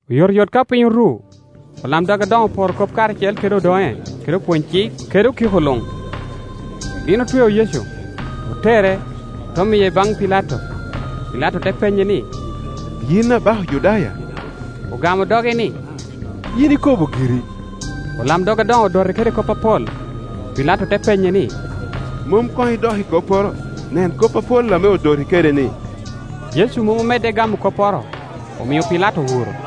Oyotoyot ka piny oru, olamdog adoŋo oporo kop karacel kede odoŋe kede opwony-cik kede okiko luŋ. Gin otweo Yecu, otere, ote miye baŋ Pilato. Pilato te penye ni, “Yin abaka Ojudaya?” Ogamo doge ni, “Yin ikobo giri.” Olamdog adoŋo odote kede kop apol. Pilato te penye ni, “Mom koŋ idok i kopporo? Nen kop apol ame odoti kede-ni.” Yecu mom omedde i gamo kopporo, omio Pilato owuro.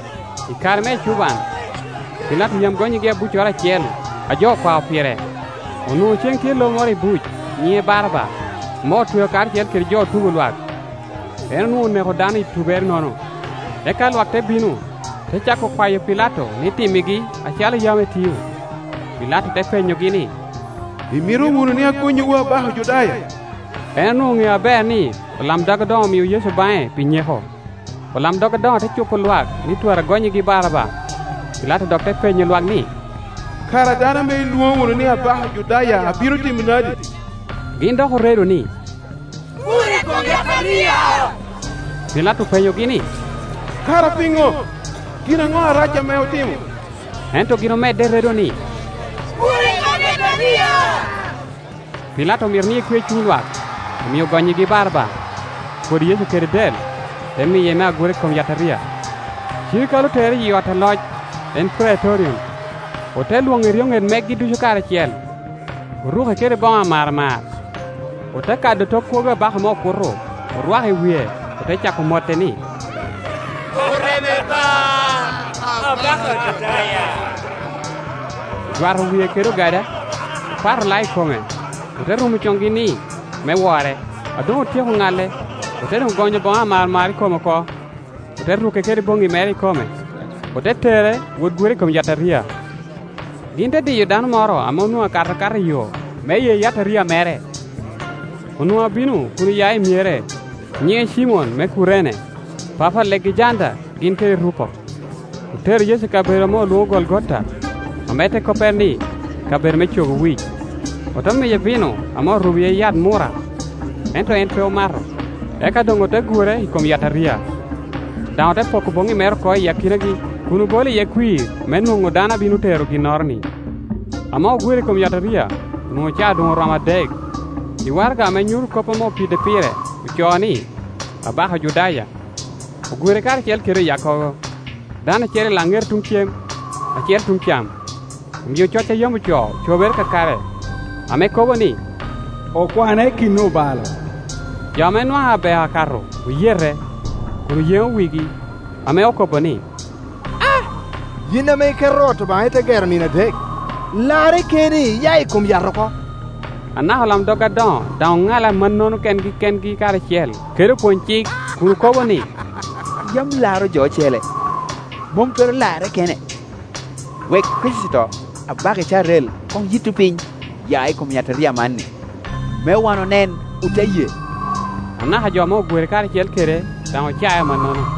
I kare me ecuban, Pilato yam gonnyigi abuccoro acel a jo okwao pire. Onwoŋo cen tye lo moro i buc nyiŋe Baraba, ame otweo karacel kede jo otubo lwak; en onwoŋo oneko dano i tubere-nono. Eka lwak te bino, te cako kwayo Pilato ni timmigi acalo yam etio. Pilato te penyogi ni, “Imito wunu ni agonnyiwu abaka Ojudaya?” En onwoŋo oŋeo aber ni olamdog adoŋo omio Yecu baŋe pi nyeko. Olamdog adoŋo te cupo lwak ni twara gonnyigi Baraba. Pilato dok te penyo lwak ni, “Kara dano ame ilwoŋo wunu ni abaka Ojudaya abino timo nadi?” Gin dok oredo ni, “Gure i kom yataria!” Pilato openyogi ni “Kara piŋo? Gin aŋo arac ame otimo?” Ento gin omedde i redo ni, “Gure i kom yataria!” Pilato omito ni ekwe cuny lwak, omio ogonnyigi Baraba. Opwodo Yecu kede del, te miye me agura i kom yataria. Cirikale otere iyi ot aloc, en Praitorion, ote lwoŋo eryoŋet megi ducu karacel. Oruke kede boŋo amaramar, ote kado tok kwogo abaka me okuto, orwako i wie, ote cako mote ni, “Oreme ba, Abaka Ojudaya!” Ojwato wie kede ogada, opato lao i kome, ote rumo coŋgi ni, me wore. A doŋ otyeko ŋale, ote doŋ gonyo boŋo amaramar i kome oko, ote ruke kede boŋŋi mere ikome, ote tere wot gure i kom yataria. Gin te diyo dano moro ame onwoŋo akato akata i yo me ye yataria mere; onwoŋo abino kun oya i myere, nyiŋe Cimon me Kurene, papa Alegejanda gin kede Rupo. Otero Yecu i kabedo ame olwoŋo Golgota, ame te koppere ni, kabedo me Cogo Wic. Ote miye vino ame orubo iye yat murra; ento en pe omato. Eka doŋ ote gure i kom yataria, daŋ ote poko boŋŋi mere oko i akinagi, kun obolo iye kwir me nwoŋo dano a bino tero ginnoro-ni. Ame ogure i kom yataria, onwoŋo caa doŋ oromo adek. I waraga ame nyuto kop ame opide pire ocoo ni, “Abaka Ojudaya.” Ogure karacel kede oyakkogo, dano acel i laŋete tuŋ cem, acel tuŋ cam. [ Omio coc a yam ocoo ocobere kakare, ame kobo ni, “Okwane i kin obalo.”] Jo ame nwaŋ abeo akato oyete, kun oyeŋo wigi, ame okobo ni, “Aaa! Yin ame iketo ot Obaŋa, ite gero i nino adek, larre keni, iya i kom yat oko!” Anaka olamdog adoŋo daŋ oŋale amannono kengi kengi karacel kede opwonycik, kun okobo ni, “Yam laro jo ocele, mom twero larre kene. Wek Kricito, Abaka Icrael, koŋ yitto piny, ya i kom yataria amanni, me wan onen ote ye,” Anaka jo ame ogure karacel kede daŋ ocae amannono.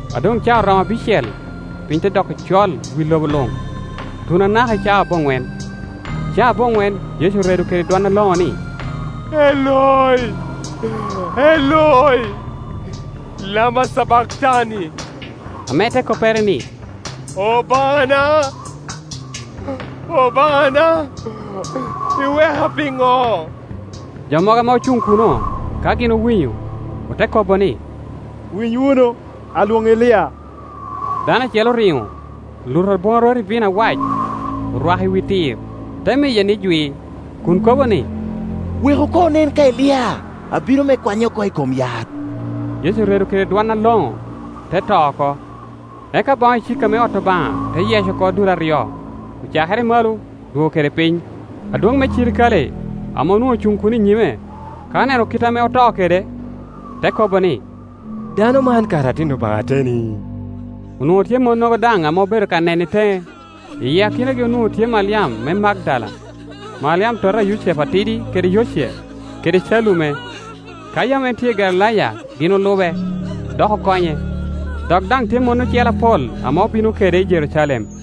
A doŋ caa oromo abicel, piny te doko col i wi lobo luŋ, tuno anaka i caa aboŋwen. Caa aboŋwen Yecu oredo kede dwon aloŋo ni, “Eloi, Eloi, lama cabaktani?” ame te koppere ni, “Obaŋana, Obaŋana, iweka piŋo?” Jo mogo ame Ocuŋ kuno, ka gin owinyo, ote kobo ni, “Winy wunu, alwoŋo Elia.” Dano acel oriŋo, oluto abwaŋarot i vino awac, orwako i wi tir, te miye ni jwi, kun kobo ni, “Weku koŋ onen ka Elia abino me kwanye oko i kom yat.” Yecu oredo kede dwon aloŋo, te to oko. Eka boŋo icika me ot Obaŋa te yec oko dul aryo, ocakere i malo, odwogo kede piny. Adwoŋ me cirikale, ame onwoŋo ocuŋ kuno i nyime, ka oneno kit ame oto kede, te kobo ni, “Dano man kara atin Obaŋa ateni!” Onwoŋo tye monnogo daŋ ame obedo ka nene i teŋe; i akinagi onwoŋo tye Maliam me Magdala, Maliam tota a Yucepu atidi kede Yoce, kede Calume. Ka yam en tye i Galilaya gin olube, dok okonye; dok daŋ tye mon ocele apol ame obino kede i Jerucalem.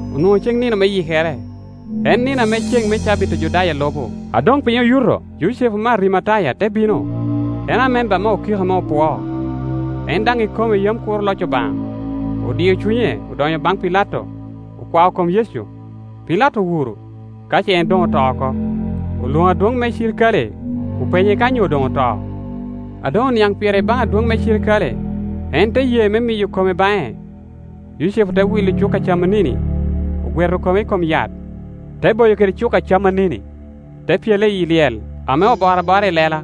Onwoŋo ceŋ nino me Yikere, en nino ame ceŋ me cabit Ojudaya lubo. A doŋ piny oyuto. Yucepu me Arimataya te bino; en amemba me okiko ame opwoo, en daŋ ikome yam kuro loc Obaŋa. Odio cunye, odonyo baŋ Pilato, okwao kom Yecu. Pilato owuro, ka ce en doŋ oto oko; olwoŋo adwoŋ me cirikale, openye ka onyo doŋ oto. A doŋ oniaŋ pire i baŋ adwoŋ me cirikale, en te ye me miyo kome baŋe. Yucepu te wilo cuka camanini, ogweto kome i kom yat, te boyo kede cuka camanini, te pyele iyi Iyel ame oboro abora i lela,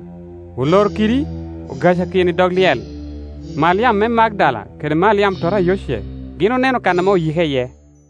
oloro kidi, ogacakino i dog lyel. Maliam me Magdala kede Maliam tota a Yoce gin oneno kan ame oyike iye.